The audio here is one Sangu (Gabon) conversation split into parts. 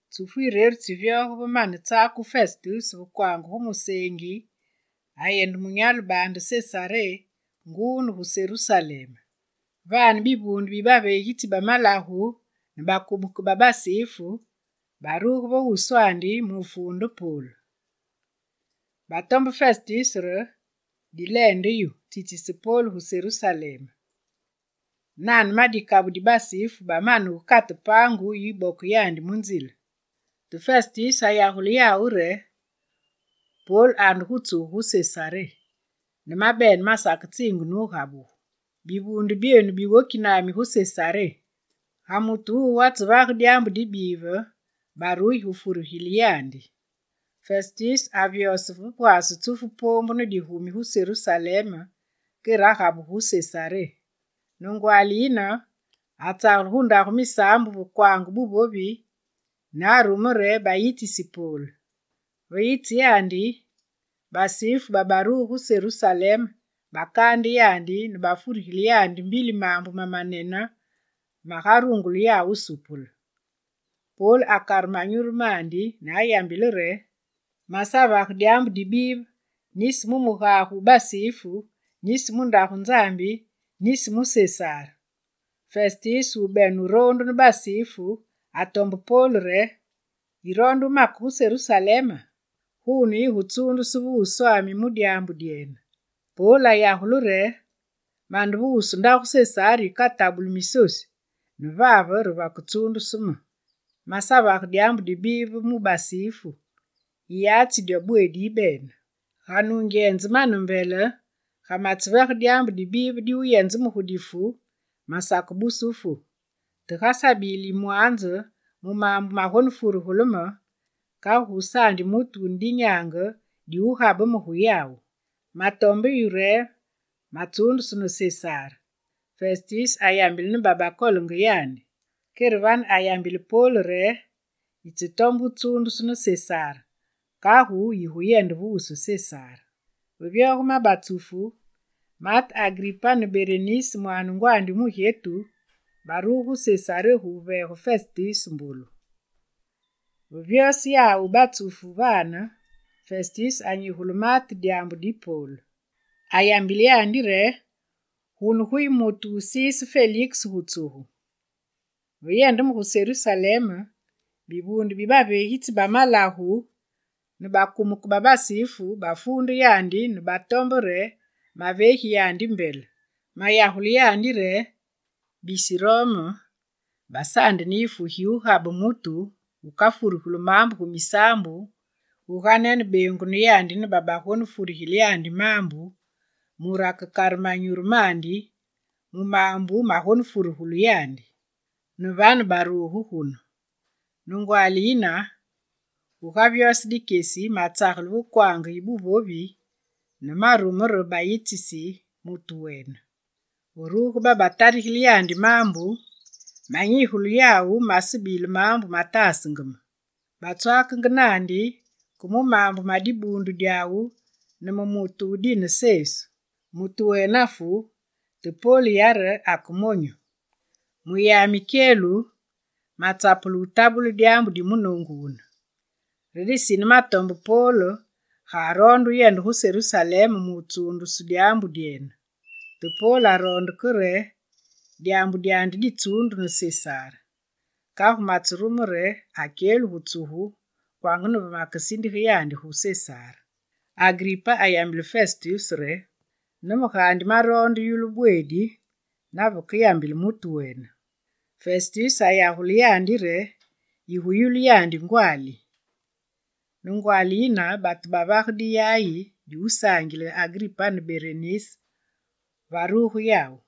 Tsufu yireru tsivyoge va mane wutsakugu Festus va kwaange gu museengi, ayende munyalu baande Sesaré nguu ne gu Serusalem. Vane, bivuunde bi baveegitsi ba malagu ne bakumeke ba basifu baruge va wuswandi mu wufuunde Pol. Batombe Festus re: «Dileende yu, tsitsise Pol gu Serusalem.» Nane ma dikabu di basifu bamane wukate paangu yi wuboke yandi mu nzile. Te Festus ayagule yawu re: «Pol ande gu tsugu gu Sesaré, ne mabene masaketsiinge ne wugabugu. Bivuunde byenu biwoki nami gu Sesaré. Ga mutu wuwu atsevage dyaambu dibive, barugi gu wufuregile yandi.» Festus avyose va pwaase tsufu poombu ne digumi gu Serusalem, kere agabugu gu Sesaré. Ne ngwaali yine atsagele gu ndagu misaambu va kwaange buvovi ne arume re bayitsisi Pol. Ve yitse yandi, basifu babaruge gu Serusalem bakaande yandi ne bafurigile yandi mbili maambu mamanene magarungule yawu wusupule. Pol akare manyuru mandi ne wuyambile re: «Masavage dyaambu dibive, nisi mu mugage wu basifu, nisi mu Ndagu Nzambi, nisi mu Sesar.» Festus wubene wuroondu ne basifu atombe Pol re: «Yiroonde wumake gu Serusalema? Guune, yigutsuundusu ve wuswami mu dyaambu dyene.» Pol ayagule re: «Mande ve wusu ndagu Sesar yikatabulu misosu ne vave re vaketsuundusu me. Masavage dyaambu dibive mu basifu, yiyatsi dyo bweedi yibene. Ga nungyenze mane mbele, ga matsevage dyaambu dibive diwuyenze me gu difu, masakebuse wufu. Te gagusabile yimwaanze mu maambu magonefurugulu me, kagu gusaandi mutu wune dinyaange diwugabe me gu yawu. Matombe yu re matsundusu ne Sesar!» Festus ayambile ne babakaloongi yandi. Kere vane, ayambile Pol re: «Yitsetombe wutsuundusu ne Sesar, kagu yiguyende ve wusu Sesar.» Ve vyoge ma batsufu, maate Agripa ne Berenis, mwaane ngwandi wu mugyetu baruge gu Sesaré gu wuveege Festus mbolu. Vavyose yawu ma batsufu vane, Festus anyigule maate dyaambu di Pol. Ayambile yandi re: «Gunu guyi mutu wusiise Feliks gu tsugu. Ve yende me gu Serusalem, bivuunde bi baveegitsi ba malagu ne bakumeke ba basifu, bafuunde yandi ne baroonde re maveegi yandi mbele. Mayagule yawu re: “Bisi Rome basaandi ne yifu gi wugabe mutu wukafurugulu maambu gu misaambu guganene bengunu yandi ne babagonefurigile yandi maambu, mure akerungule wukare manyuru mandi mu maambu magonetarugulu yandi.” Ne vane, yawu baruge gunu. Ne ngwaali yine, gugavyose dikyesi, matsagele ve kwaange yi buvovi ne marume re bayitsisi mutu wene. Va ruge babatarigile yandi maambu, manyigule yawu masebile maambu mataasenge me. Batswaakenge naandi ke mu maambu ma dibuundu dyawu ne mu mutu wu dine Sesu. Mutu wene afu, te Pol yare ake monyu. Mu yami kyelu, matsapulu mu wutabule dyaambu di munoongu wune. Re disine matombe Pol ga aroonde wuyende gu Serusalem mu wutsuundusu mu dyaambu dyene. Te Pol aroonde ke re dyaambu dyandi ditsuundu ne Sesar. Kagu matserume re akyelu gu tsugu kwanga ne ve makesindige yandi gu Sesar.» Agripa ayambile Festus re: «Ne me gaandi, maroonde wuyulu bweedi naveke yambile mutu wene.» Festus ayagule yandi re: «Yiguyulu yandi ngwaali.» Ne ngwaali yine, batu bavage diyayi diwusaangile Agripa ne Berenis varuge yawu.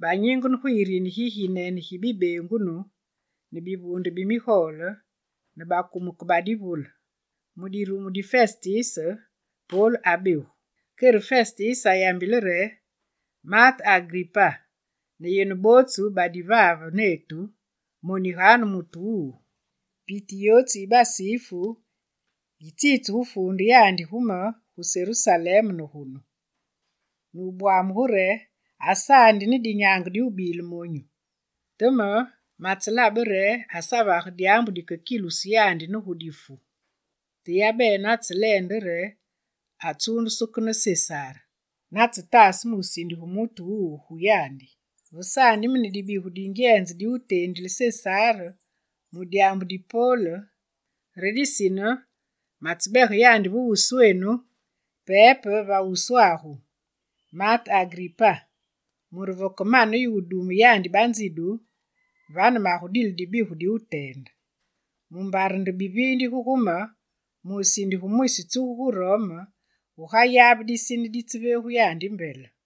Banyingene gu yirini giginene gi bibeengunu, ne bivuunde bi migole, ne bakumeke ba divule. Mu dirumu di Festus, Pol abegu. Kere Festus ayambile re: «Maate Agripa ne yenu bootsu badi vave netu, moniganu mutu wuwu. Piti yootsu yi basifu yitsitse gu wufuunde yandi gu me, gu Serusalem ne gunu, ne wubwamuge re: “Asaandi ne dinyaange diwubebile monyu!” Te me, matselabe re asavage dyaambu dikekilusu yandi ne difu. Te yabene atseleende re atsuundusu ke ne Sesar; natsetaase me wusindige mutu wuwu gu yandi. Vesaandi me ne dibigu dingyenze diwuteendile Sesar mu dyaambu di Pol, re disine matsebege yandi va wuswenu, pepe va wuswagu maate Agripa, mure vakemane yu wudume yandi banzidu, vane magudile dibigu diwuteende. Mumbare nde biviindige gu me, mu wusindige mwisi tsugu gu Rome, gugayabe disine ditseveegu yandi mbele.»